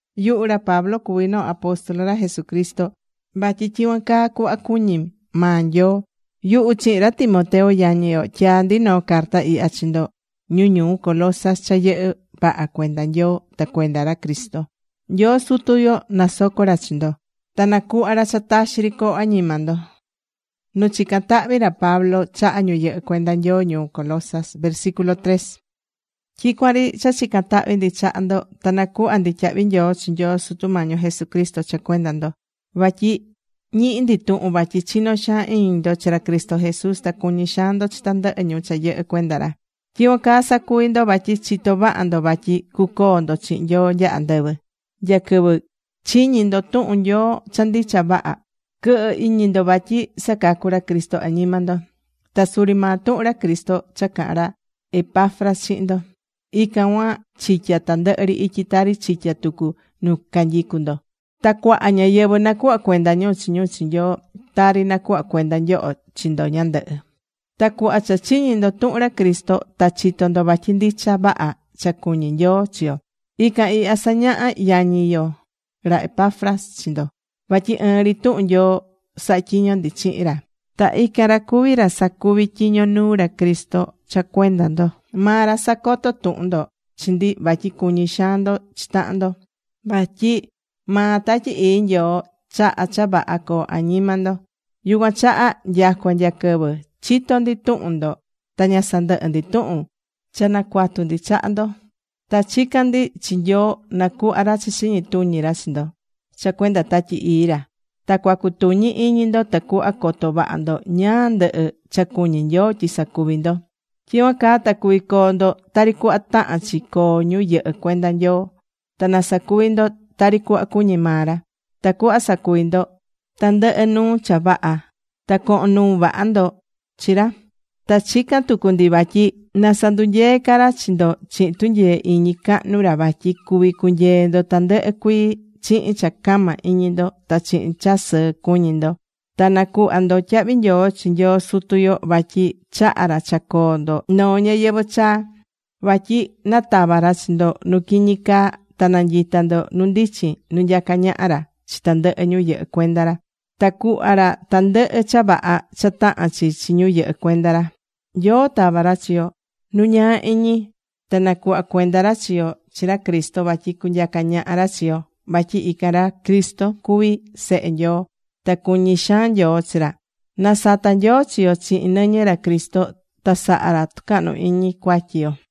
Yuhu ra Pablo cuví noo apóstol ra Jesucristo. Vatyi tyicuan caa cuhva cuñí maa Nyoo. Yuhu chihin ra Timoteo yañi yo, tyaá ndi noo carta ihya chi ndo ñu ñuu Colosas cha yɨhɨ́ vaha cuenda Nyoo ta cuenda ra Cristo. Nyoo Sutu yo nasoco ra chi ndo ta nacuhva ra cha taxi ri coo añima ndo.Nu chicán tahvi ra Pablo chaha ñu yɨhɨ́ cuenda Nyoo ñuu Colosas Tyicuan ri cha chicán tahvi ndi chaha ndo. Ta nacuhvá ndi tyahvi nyoo chi Nyoo Sutu Sutu Mañi yo Jesucristo cha cuenda ndo. Vatyi ñihí ndi tuhun vatyi chinó xaan iñi ndo chi ra Cristo Jesús. Ta cuñí xaan ndo chi tandɨhɨ ñu cha yɨhɨ́ cuenda ra. Tyicuan caa sacuví ndo vatyi chitó vaha ndo vatyi cucoo ndo chihin Nyoo nya andɨvɨ. Nya quɨvɨ chiñi̱ ndo tuhun Nyoo cha ndicha vaha, quɨhɨ iñi ndo vatyi sacacú ra Cristo añima ndo. Ta suri maa tuhun ra Cristo cha caha̱n ra Epafras chihin ndo, ican cuan chityá tandɨhɨ ri ityi tari chityá tucu nu canyicú ndo. Ta cuaha ñáyɨvɨ nacuhvá cuenda ñu chi ñu chi Nyoo, tari nacuhva̱ cuenda nyoho chi ndo ñandɨhɨ. Ta cuhva cha chiñi̱ ndo tuhun ra Cristo, ta chito̱ ndo vatyi ndicha vaha cha cuñí Nyoo chi yo. Ican ihya sañaha̱ yañi yo ra Epafras chi ndo. Vatyi ɨɨn ri tuhun Nyoo sahá tyiño ndi chihin ra. Ta ican ra cuví ra sacuví tyiño nuu ra Cristo cha cuenda ndo. Maa ra sacoto̱ tuhun ndo chi ndi, vatyi cuñí xaan ndo chi tahan ndo. Vatyi maa Tatyi Ii Nyoo chahá cha vaha coo añima ndo. Yucuan chaha nyacua nya quɨvɨ chito̱ ndi tuhun ndo ta ña sandɨhɨ́ ndi tuhun cha nacuatu ndi chaha ndo. Ta chicán ndi chi Nyoo nacuhva ra cha chiñi tuñi ra chi ndo cha cuenda Tatyi Ii ra. Ta cuacutuñi iñi ndo tacuhva coto vaha ndo ñáá ndɨhɨ cha cuñí Nyoo tyi sacuví ndo. Tyicuan caa ta cuví coo ndo tari cuhva tahán chi coo ñu yɨhɨ́ cuenda Nyoo. Ta na sacuvi ndo tari cuhva cuñí maa ra. Tacuhva sacuvi ndo tandɨhɨ nuu cha vaha ta cohon nuu vaha ca ndo chi ra. Ta chicán tucu ndi vatyi na sandunyee ca ra chi ndo chihin tunyee iñi cahnu ra vatyi cuví cunyee ndo tandɨhɨ cuii chihin cha cama iñi ndo. Ta chihin cha sɨɨ cuñí ndo, ta nacuhvá ndo tyahvi nyoo chi Nyoo Sutu yo, vatyi chahá ra cha coo ndo noo ñayɨvɨ̱ chaa. Vatyi natava̱ ra chi ndo nu quiñi caa, ta nanyita̱ ndo nu ndichin nu nyacá ñaha ra chi tandɨhɨ ñu yɨhɨ́ cuenda ra. Ta cuhva ra tandɨhɨ cha vaha cha tahán chi chi ñu yɨhɨ́ cuenda ra. Nyoo tava̱ ra chi yo nu ñaa iñi ta nacuhva̱ cuenda ra chi yo chi ra Cristo vatyi cunyaca ñaha ra chi yo. Vatyi ican ra Cristo cuví Sehe Nyoo. Ta cuñí xaan Nyoo chi ra. Nasata̱ Nyoo chi yo chihin nɨñɨ ra Cristo ta saha̱ ra tucahnu iñi cuatyi yo.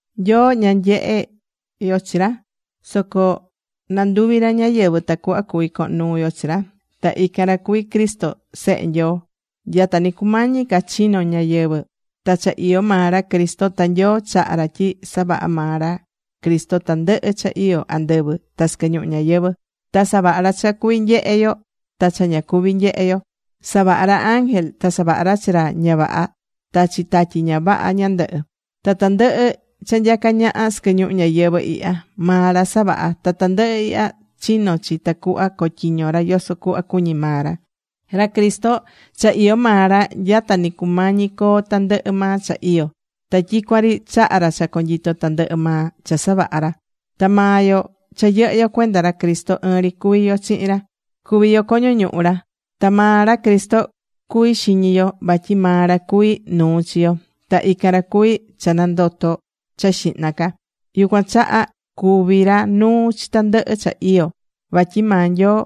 Nyoo, ña nyehé yo chi ra. Soco nanduvi̱ ra ñáyɨvɨ tacuhva cuví cohon nuu yo chi ra. Ta ican ra cuví Cristo Sehe Nyoo. Nya ta nɨ cumañi ca chino̱ ñayɨvɨ̱ ta cha iyó maa ra Cristo. Ta Nyoo chaha̱ ra tyi savaha̱ maa ra Cristo tandɨhɨ cha iyo andɨvɨ ta sɨquɨ ñuhu ñayɨvɨ̱. Ta savaha̱ ra cha cuví nyehe yo ta cha ña cuví nyehe yo. Savaha̱ ra ángel. Ta savaha̱ ra chi ra ña vaha ta chi tatyi ña vaha ñandɨhɨ. Ta tandɨhɨ cha nyacá ñaha sɨquɨ ñuhu ñayɨvɨ̱ ihya, maa ra savaha̱. Ta tandɨhɨ ihya chino̱ chi tacuhva cotyiñó ra yoso cuhva cuñí maa ra. Ra Cristo cha iyó maa ra nya ta nɨ cumañi coo tandɨhɨ maa cha iyó. Ta tyicuan ri chahá ra cha conyito tandɨhɨ maa cha savaha̱ ra. Ta maa yo cha yɨhɨ́ yo cuenda ra Cristo, ɨɨn ri cuví yo chihin ra. Cuví yo coño ñuhu ra. Ta maa ra Cristo, cuví xiñi yo, vatyi maa ra cuvi nuu chi yo. Ta ican ra cuví cha nandoto̱ cha xihna ca. Yucuan chaha cuví ra nuu chi tandɨhɨ cha iyó. Vatyi maa Nyoo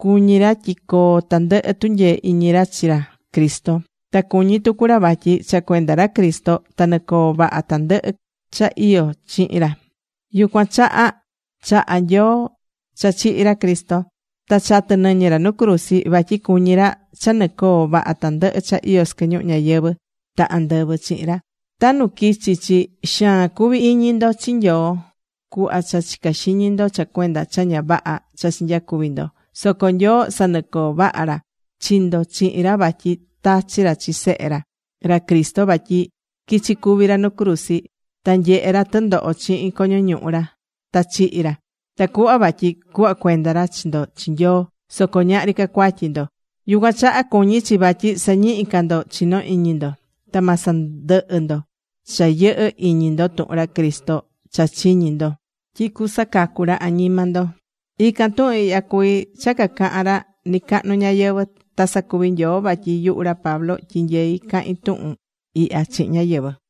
cuñí ra tyi coo tandɨhɨ tunyee iñi ra chi ra Cristo. Ta cuñí tucu ra vatyi cha cuenda ra Cristo ta nɨcoó vaha tandɨhɨ cha iyó chihin ra. Yucuan chaha chaha̱ Nyoo cha chihi̱ ra Cristo. Ta chatɨ̱ nɨñɨ ra nu cruzi. Vatyi cuñí ra cha nɨcoó vaha tandɨhɨ cha iyó sɨquɨ ñuhu ñayɨvɨ̱ ta andɨvɨ chihin ra. Ta nu quichi̱ chi, xaan cuvi̱ iñi ndo chi Nyoo cuhva cha chica̱ xiñi ndo cha cuenda cha ña vaha cha chinyacuvi̱ ndo. Soco Nyoo sanɨcoo̱ vaha ra chi ndo chihin ra vatyi tachi̱ ra chi Sehe ra, ra Cristo vatyi quichi̱ cuvi ra nu cruzi. Ta nyehe̱ ra tɨndoho chihin coño ñuhu ra ta chihi̱ ra, tacuhva vatyi cuhva cuenda ra chi ndo chi Nyoo, soco ñahri ca cuatyi ndo. Yucuan chaha cuñí chi vatyi sañihí ca ndo chinó iñi ndo. Ta ma sandɨhɨ ndo cha yɨhɨ iñi ndo tuhun ra Cristo cha chiñi̱ ndo tyi cusacacu ra añima ndo. Ican tuhun ihya, cuví cha cacahán ra nɨcacahnu ñayɨvɨ̱. Ta sacuvi Nyoo vatyi yuhu ra Pablo tyinyeí cahín tuhun ihya chihin ñáyɨvɨ.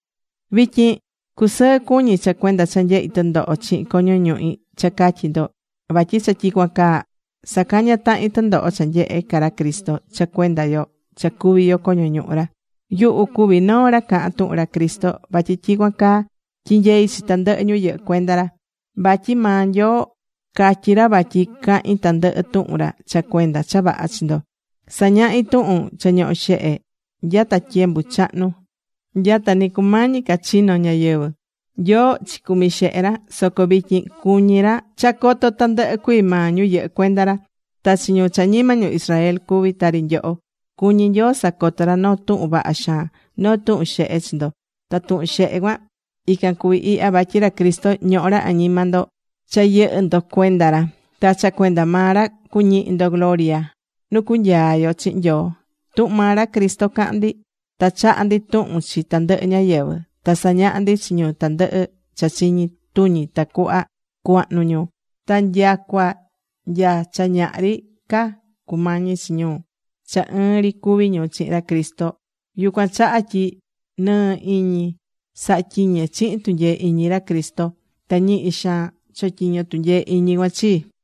Vityin cusɨɨ cuñí cha cuenda cha nyehí tɨndoho chihin coño ñuhi cha catyi ndo. Vatyi cha tyicuan caa sacañá tahin tɨndoho cha nyehe ca ra Cristo cha cuenda yo cha cuví yo coño ñuhu ra. Yuhu cuví noo ra cahán tuhun ra Cristo vatyi tyicuan caa tyinyeí chi tandɨhɨ ñu yɨhɨ́ cuenda ra. Vatyi maa Nyoo catyí ra vatyi cahin tandɨhɨ tuhun ra cha cuenda cha vaha chi ndo. Sañahí tuhun cha ñoho̱ xehe nya ta tyembu chahnu, nya ta ni cumañi ca chino ñayɨvɨ̱. Nyoo chicumi xehe ra. Soco vityin cuñí ra cha coto tandɨhɨ cuii maa ñu yɨhɨ́ cuenda ra. Ta chi ñu cha ñima ñu Israel cuví tari nyoho, cuñí Nyoo sacotó ra noo tuhun vaha xaan, noo tuhun xehe chi ndo. Ta tuhun xehe cuan ican cuví ihya, vatyi ra Cristo ñohó ra añima ndo cha yɨhɨ ndo cuenda ra. Ta cha cuenda maa ra cuñihi ndo gloria nu cunyaa yo chihin Nyoo. Tuhun maa ra Cristo cahán ndi. Ta chahá ndi tuhun chi tandɨhɨ ñáyɨvɨ. Ta sañahá ndi chi ñu tandɨhɨ cha chiñi tuñi, tacuhva cuahnu ñu ta nyacua nya cha ñahri ca cumañi chi ñu cha ɨɨn ri cuví ñu chihin ra Cristo. Yucuan chaha tyi nɨɨ́ iñi sahá tyiñe chihin tunyee iñi ra Cristo ta ñihi xaan chotyiñó tunyee iñi cuan chii.